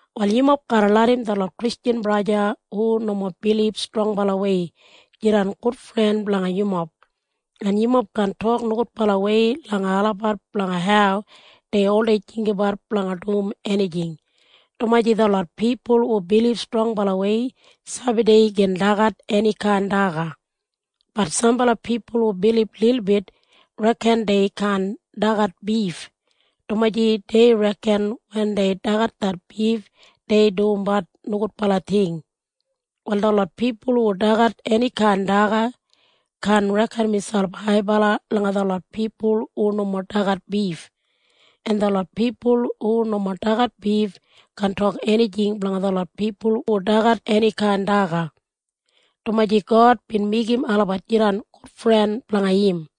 Wal yumob garra larram detlot Kristjan braja en sista olasbat hu nomo bilib strongbalawei jidan gudfren blanga yumob. En yumob kaan tok nogudbalawei langa olabat blanga hau dei oldei jinggabat blanga dum enijing, dumaji detlot pipul hu bilib strongbalawei sabi dei gin dagat enikain daga. Bat sambala pipul hu bilib lilbit reken dei kaan dagat bif, dumaji dei reken wen dei dagat det bif, dei dumbat nogudbala ting. Wal detlot pipul hu dagat enikain daga kaan reken miselp haibala langa detlot pipul hu nomo dagat bif. En detlot pipul hu nomo dagat bif kaan tok enijing blanga detlot pipul hu dagat enikain daga, dumaji God bin meigim olabat jidan gudfren blanga im.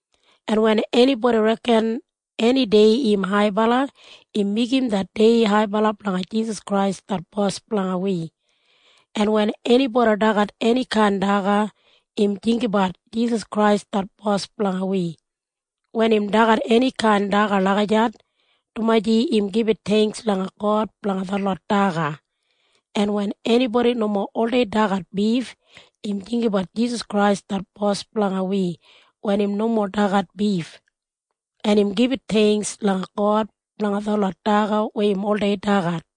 En wen enibodi reken eni dei im haibala, im meigim det dei haibala blanga Jisas Krais det Bos blanga wi. En wen enibodi dagat enikain daga, im jinggabat Jisas Krais det Bos blanga wi wen im dagat enikain daga lagijat, dumaji im gibit theingks langa God blanga detlot daga. En wen enibodi nomo oldei dagat bif, im jinggabat Jisas Krais det Bos blanga wi wen im nomo dagat bif, en im gibit theingks langa God blanga detlot daga weya im oldei dagat.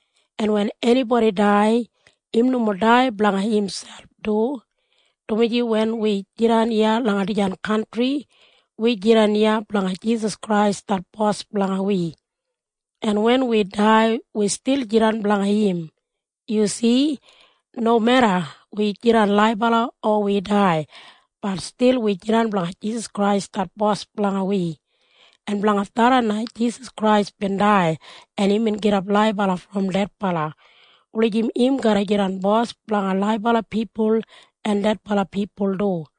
En wen enibodi dai, im nomo dai blanga imselp du, dumaji wen wi jidan iya langa dijan kantri, wi jidan iya blanga Jisas Krais det Bos blanga wi. En wen wi dai, wi stil jidan blanga im. Yu si? Nomeda wi jidan laibala o wi dai, bat stil wi jidan blanga Jisas Krais det Bos blanga wi. En blanga tharran na Jisas Krais bin dai en imbin gidap laibala brom dedbala wulijim im garra jidan Bos blanga laibala pipul en dedbala pipul du.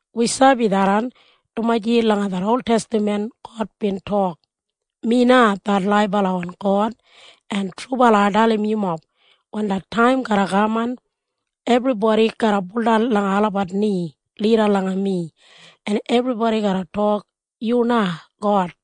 Wi sabi tharran, dumaji langa det oltestaman God bin tok, “Mi na det laibalawan God, en trubala ai dalim yumob. Wen det taim garra kaman, ebribodi garra baudan langa olabat ni lida langa mi, en ebribodi garra tok, ‘Yu na God’.”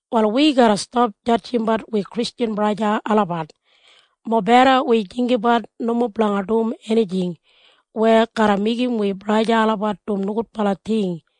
Wal wi garra stap jadjimbat wi Kristjan braja en sista olabat. Mobeda wi jinggabat nomo blanga dum enijing weya garra meigim olabat dum nogudbala ting.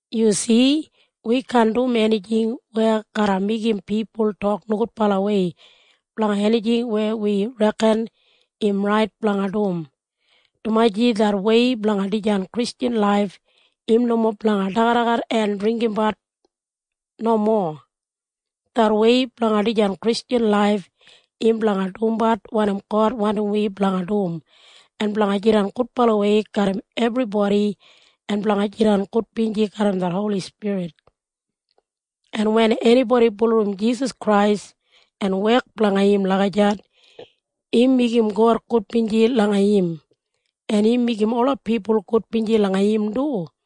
Yu si? Wi kaan dum enijing weya garra meigim pipul tok nogudbalawei blanga enijing weya wi reken im rait blanga dum, dumaji det wei blanga dijan Kristjan laif im nomo blanga dagadagat en dringgimbat. Nomo. Det wei blanga dijan Kristjan laif im blanga dumbat wanim God wandim wi blanga dum en blanga jidan gudbalawei garram ebribodi en blanga jidan gudbinji garram det Holi Spirit. En wen enibodi bulurrum Jisas Krais en wek blanga im lagijat, im meigim God gudbinji langa im, en im meigim ola pipul gudbinji langa im du.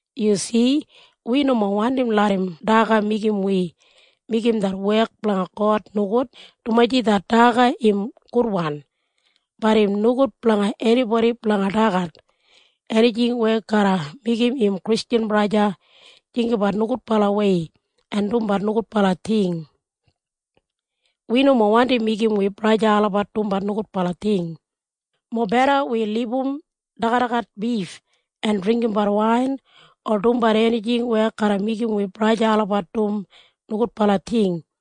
Yu si? Wi nomo wandim larram daga meigim wi meigim det wek blanga God nogud, dumaji det daga im gudwan. Bat im nogud blanga enibodi blanga dagat enijing weya garra meigim im Kristjan braja o sista jinggabat nogudbalawei en dumbat nogudbala ting. Wi nomo wandi meigim wi braja o sista olabat dumbat nogudbala ting. Mobeda wi libum dagadagat bif en dringgimbat wain o dumbat enijing weya garra meigim wi braja o sista olabat dum nogudbala ting.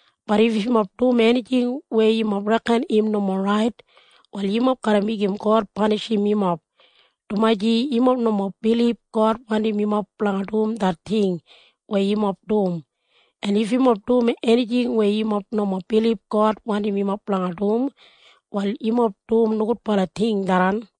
Bat if yumob dum enijing weya yumob reken im nomo rait, wal yumob garra meigim God panishim yumob, dumaji yumob nomo bilib God wandim yumob blanga dum det ting weya yumob dum. En if yumob dum enijing weya yumob nomo bilib God wandim yumob blanga dum, wal yumob dum nogudbala ting tharran.